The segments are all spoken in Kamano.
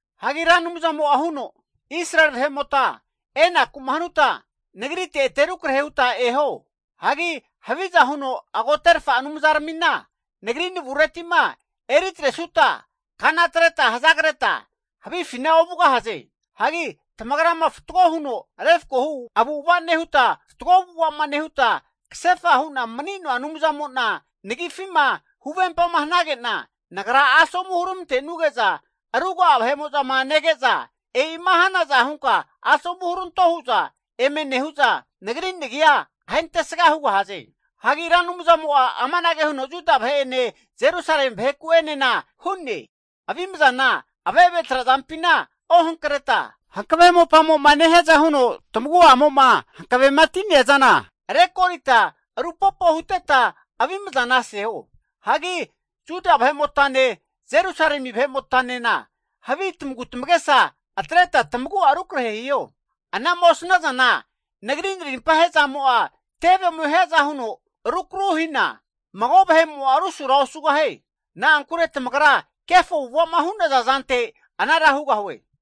Hagi Ra Anumzamo'a huno, Israeli vahe'mota enaku'ma hanuta nagrite ete rukrahe huta eho. Hagi haviza huno agoterfa anumzaramina Nagri navureti'ma eri atresuta kana atreta hazagreta havifina ovugahaze. Hagi tamagrama fatgo huno refkohu avu'ava nehuta, fatgo avu'ava'ma nehuta kasefa hu'na mani'noa Anumzamo'na nagifima huvempama hanage'na, Nagra asomu huramantenuge'za ruga'a vahe'mo'zama nege'za, e'ima hanaza hunka asomu huranto hu'za eme nehu'za, Nagri nagi'a ahentesga hugahaze. Hagi Ra Anumzamo'a amanage huno Juda vahe'ene Jerusalemi vaheku'enena hu'ne. Avimzana ave've trazampina ohankreta, hankave mopamo'ma nehiaza huno tamagu'amo'ma hankavema ti'neazana, rekorita rupopo huteta avimzana aseho. Hagi Juda vahe'motane Jerusalemi vahe'motanena havi tamagutamagesa atreta tamagu'a rukrahe hiho. A'nama osnazana Nagri narimpa he'zamo'a tevemo hiaza huno rukru hina, mago vahe'mo'a rusura osugahie. Na'ankure tamagra kefo avu'ava'ma hu'naza zante anara hugahue.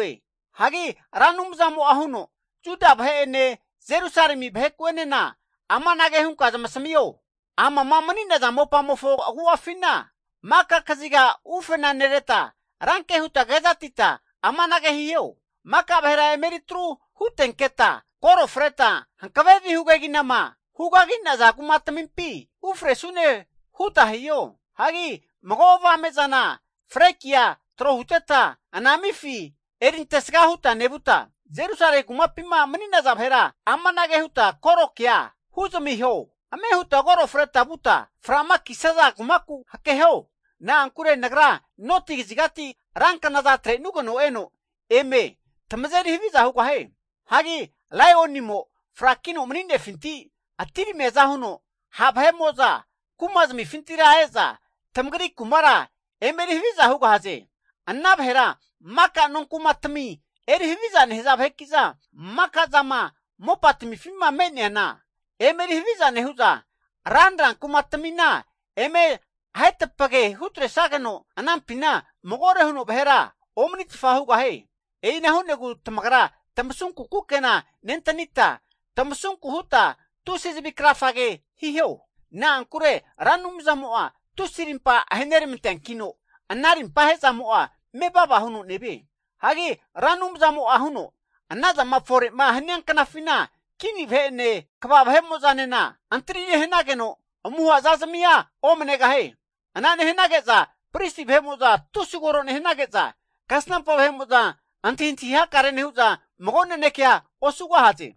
Hagi Ra Anumzamo'a huno, Juda vahe'ene Jerusalemi vaheku'enena amanage hunka zamasamio hu'ne. Amama mani'naza mopamofo agu'afina maka kaziga ufena nereta, ranke huta kezatita amanage hiho. Maka vahera eme eri tru hutenketa, koro freta hankave vihu keginama hu kagi'naza kumatamimpi ufresune huta hiho! Hagi mago avame zana flekia tro huteta anamifi erintesga huta nevuta, Jerusalemi kumapima mani'naza vahera amanage huta korokea huzamiho. Ame huta koro freta vuta fra'ma kisaza kumaku hakeho. Na'ankure Nagra noti kazigati ranknaza atre'nugeno eno eme tamazeri haviza hugahie. Hagi laionimo frakino mani'nefinti atiramiaza huno, ha' vahe'mo'za kumazamifintira e'za tamagri kumara eme eri haviza hugahaze. Ana vahera maka nonkumatami eri haviza nehaza vaheki'za maka zama mopatamifima me'neana eme eri haviza nehu'za, ranra kumatamina eme ahetapage hutresageno anampina magore huno vahera omanitfa hugahie. E'ina hu'negu tamagra tamasunku kukena nentanita, tamasunku huta tusi zavi krafage hiho. Na'ankure Ra Anumzamo'a tusi arimpa aheneranteankino, ana rimpa ahezamo'a mevava huno nevie. Hagi Ra Anumzamo'a huno, anazama fore'ma hania knafina kini vahe'ene kva vahe'mo'zanena, antri nehanageno muha zazamia omanegahie. Ana nehanage'za pristi vahe'mo'za tusi koro nehanage'za, kasnampa vahe'mo'za antahintahi hakare nehu'za mago nanekea osugahaze.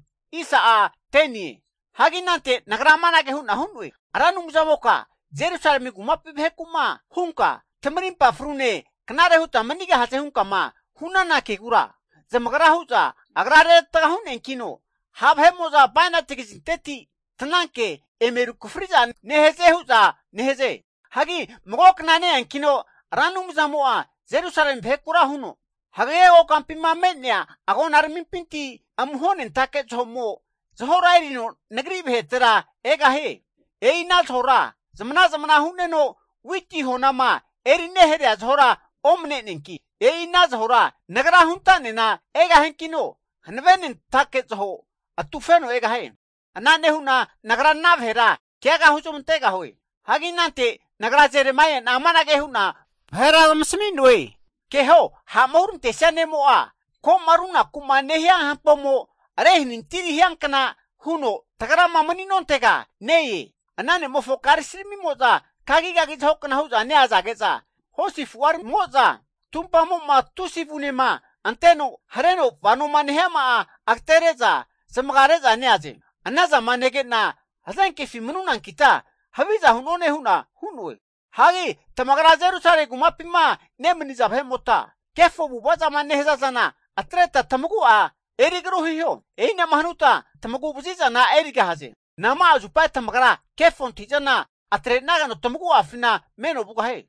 Hagi anante nagra amanage hu'na hu'noe. Ra Anumzamoka Jerusalemi kumapi vaheku'ma hunka, tamarimpa frune knare huta manigahaze hunka'ma hu'nana kegura, zamagra hu'za agra reravatga hu'neankino, ha' vahe'mo'za bainati kazinteti tananke eme rukafari'za nehaze hu'za nehaze. Hagi mago kna ne-eankino Ra Anumzamo'a Jerusalemi vahekura huno, hagage kokampima me'nea agonaramimpinti amuhonentake zaho'mo zahora erino nagri vahetera egahie. E'ina zahora zamana zamana hu'neno witi honama eri neharea zahora omane'neanki, e'i ana zahora Nagra hunta'nena egahiankino, hankavenentake zaho atufeno egahie. Ana nehu'na Nagra ana vahera keaga huzamantegahue. Hagi anante nagra Jeremaia'na amanage hu'na vahera zamasami'noe. Keho, ha'ma hurantesia ne'mo'a ko'ma runaku'ma nehia hampomo rehanintiri hiankna huno tagrama mani'nontega ne-e. Ana ne'mofo karisiramimo'za kagigagi zahokna hu'za neazage'za, hosi afu'aramimo'za tumpamo'ma tusi avunema anteno hareno vanoma nehiama'a agatere'za zamagare'za neaze. Anazama nege'na hazenkefi manunankita haviza hu'none hu'na hu'noe. Hagi tamagra Jerusalemi kumapima nemaniza vahe'mota, kefo avu'ava zama nehaza zana atreta tamagu'a eri agru hiho. E'ina'ma hanuta tamagu vazi'zana erigahaze. Nama'a zupa tamagra kefo antahi'zana atre'nageno tamagu'afina meno vugahie.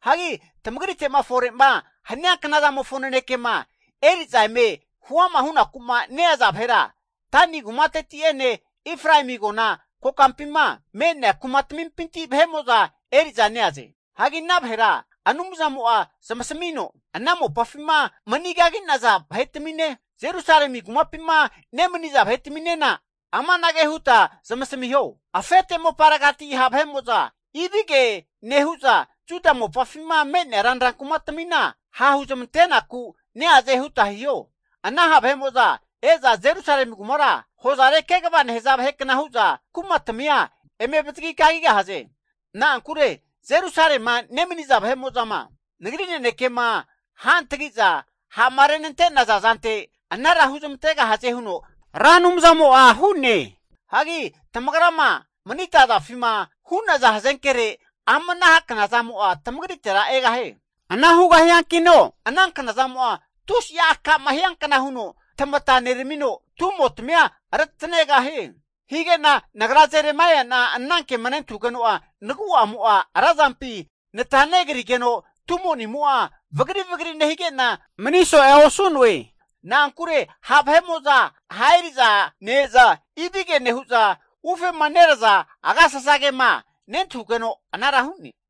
Hagi tamagrite'ma fore'ma hania knazamofo nanekema eri'za eme huama hunaku'ma neaza vahera, Dani kumateti'ene Efraemi agona kokampima me'nea kumatamimpi vahe'mo'za eri'za neaze. Hagi ana vahera Anumzamo'a zamasamino, ana mopafima mani kagi'naza vahetamine, Jerusalemi kumapima nemaniza vahetaminena amanage huta zamasamiho, Afete moparegati ha' vahe'mo'za ibige nehu'za Juda mopafima me'nea ranra kumatamina hahu zamantenaku neaze huta hiho. Ana ha' vahe'mo'za e'za Jerusalemi kumara, hozare kegava nehaza vahe kna hu'za kumatamia eme avazagi kagigahaze. Na'ankure Jerusalema nemaniza vahe'mo'zama Nagri nanekema ru hantagi'za ha'ma renante'naza zante anara huzmantegahaze huno Ra Anumzamo'a hu'ne. Hagi tamagrama manita azafima hu'naza hazenkere ama ana knazamo'a tamagritera egahie. Ana hugahiankino ana knazamo'a tusi'a akama hiankna huno tamata neramino tumo'tamia retanegahie. Hige'na nagra Jeremaia'na anankema nentahugeno'a, nagu'amo'a razampi nata negrigeno, tumonimo'a vagri vagri nehige'na mani so'ea osu'noe. Na'ankure ha' vahe'mo'za ha' eri'za ne-eza, ibige nehu'za ufema neraza agasasagema nentahugeno anara hu'ne.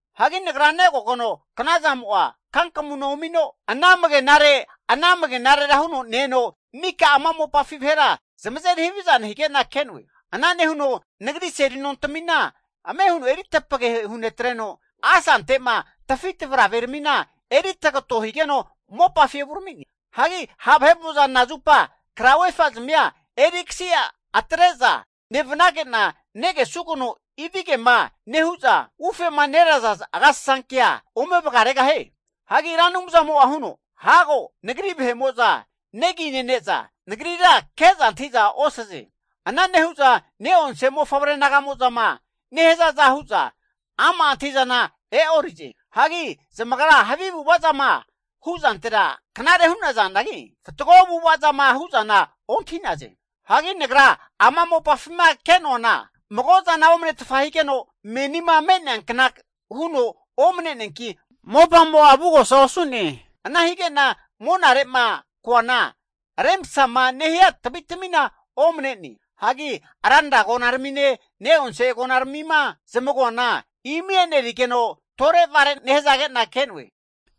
Hagi nagra negogeno knazamo'a kankamuna omino anamagenare anamagenarera huno ne-eno mika ama mopafi vahera zamazeri haviza nehige'na ke'noe. Ana nehuno nagri seli nontamina ame huno eri tapage hunetreno, asante'ma tafi tavaraveramina eri tagato higeno mopafi evurami'ne. Hagi ha' vahe'mo'za nazupa krauefa (fleki) zamia erikasi atre'za nevanage'na negesugeno ibigema nehu'za ufema neraza agasasankea ome vagaregahie? Hagi Ra Anumzamo'a huno, hago Nagri vahe'mo'za negi nene'za Nagrira ke'za antahi'za osaze. Ana nehu'za ne'onse mofavre naga'mo'zama nehazaza hu'za ama' antahi'zana e'orize. Hagi zamagra havi avu'ava zama hu'zantera knare hu'nazanagi, fatgo avu'ava zama hu'zana ontahi'naze. Hagi nagra ama mopafima ke'noana mago zana omanetfa higeno, menima me'neankna huno omane'neanki mopamo'a avugosa osu'ne. Ana hige'na monare'ma koana remsama nehia tavitamina omane'ne. Hagi ranra agonaramine ne'onse agonaramima zamagoana imi enerigeno, tore vare nehazage'na ke'noe.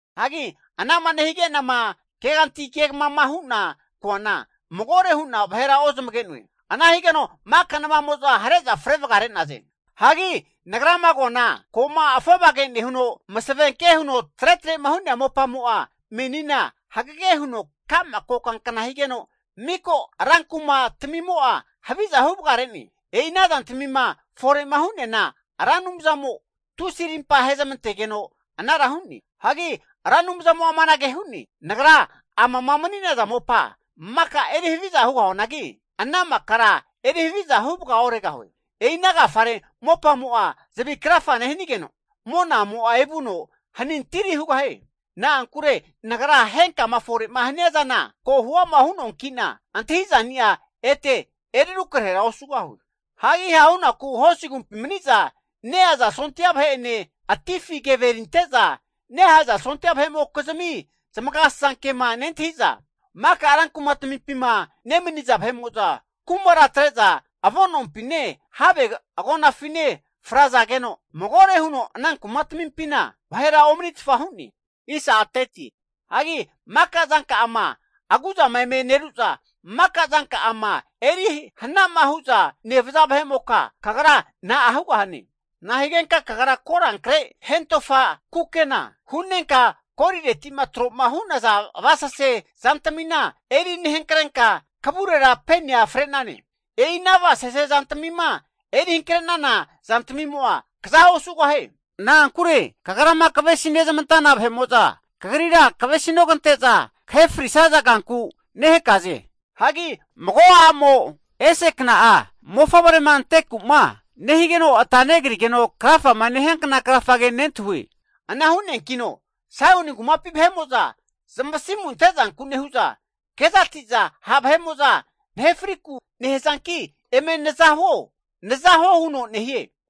Hagi anama nehige'nama keganti kegamama hu'na koana, magore hu'na vahera ozamage'noe. Ana higeno maka namamo'za hare'za fre vagare'naze. Hagi nagrama koana ko'ma afovage nehuno masavenke huno tretre'ma hu'nea mopamo'a menina hagege huno ka'ma kokankna higeno, miko rankuma tamimo'a haviza huvagare'ne. E'ina zantamima fore'ma hu'neana Ra Anumzamo tusi rimpa ahezamantegeno anara hu'ne. Hagi Ra Anumzamo'a amanage hu'ne. Nagra amama mani'naza mopa maka eri haviza hugahuanagi, ana makara eri haviza huvaga oregahue. E'ina agafare mopamo'a zavi krafa nehanigeno, monamo'a evuno hanintiri hugahie. Na'ankure nagra henkama fore'ma hania zana ko huama hu'noanki'na, antahizani'a ete eri rukrahera osugahue. Hagi hahunaku hosi agumpi mani'za neaza sondia vahe'ene, atifi keve erinte'za nehaza sondia vahe'mokizmi zamagasasankema nentahi'za, maka rankumatamimpima nemaniza vahe'mo'za kumara atre'za avonompine, have agonafine frazageno magore huno ana kumatamimpina vahera omanitfa hu'ne. Hagi maka zanka'ama aguzama eme neruza maka zanka'ama eri hana'ma hu'za nevaza vahe'moka kagra na'a hugahane? Nahigenka kagra korankre hentofa kukena hu'nenka, golireti'ma tro'ma hu'naza avasase zantamina eri nehankrenka kavurera penia fre'nane? E'ina avasase zantamima eri hankare'nana zantamimo'a kaza osugahie. Na'ankure kagrama kavesi nezmantana vahe'mo'za, kagrira kavesinogante'za kahe frisaza kanku nehakaze. Hagi mago a'mo ese kna'a mofavrema anteku'ma nehigeno ata negrigeno krafama nehiankna krafage nentahue. Ana hu'neankino Saioni kumapi vahe'mo'za zamasimu ante'zanku nehu'za, kezati'za ha' vahe'mo'za nahe friku nehazanki eme naza huo, naza huo hu'za nehaze.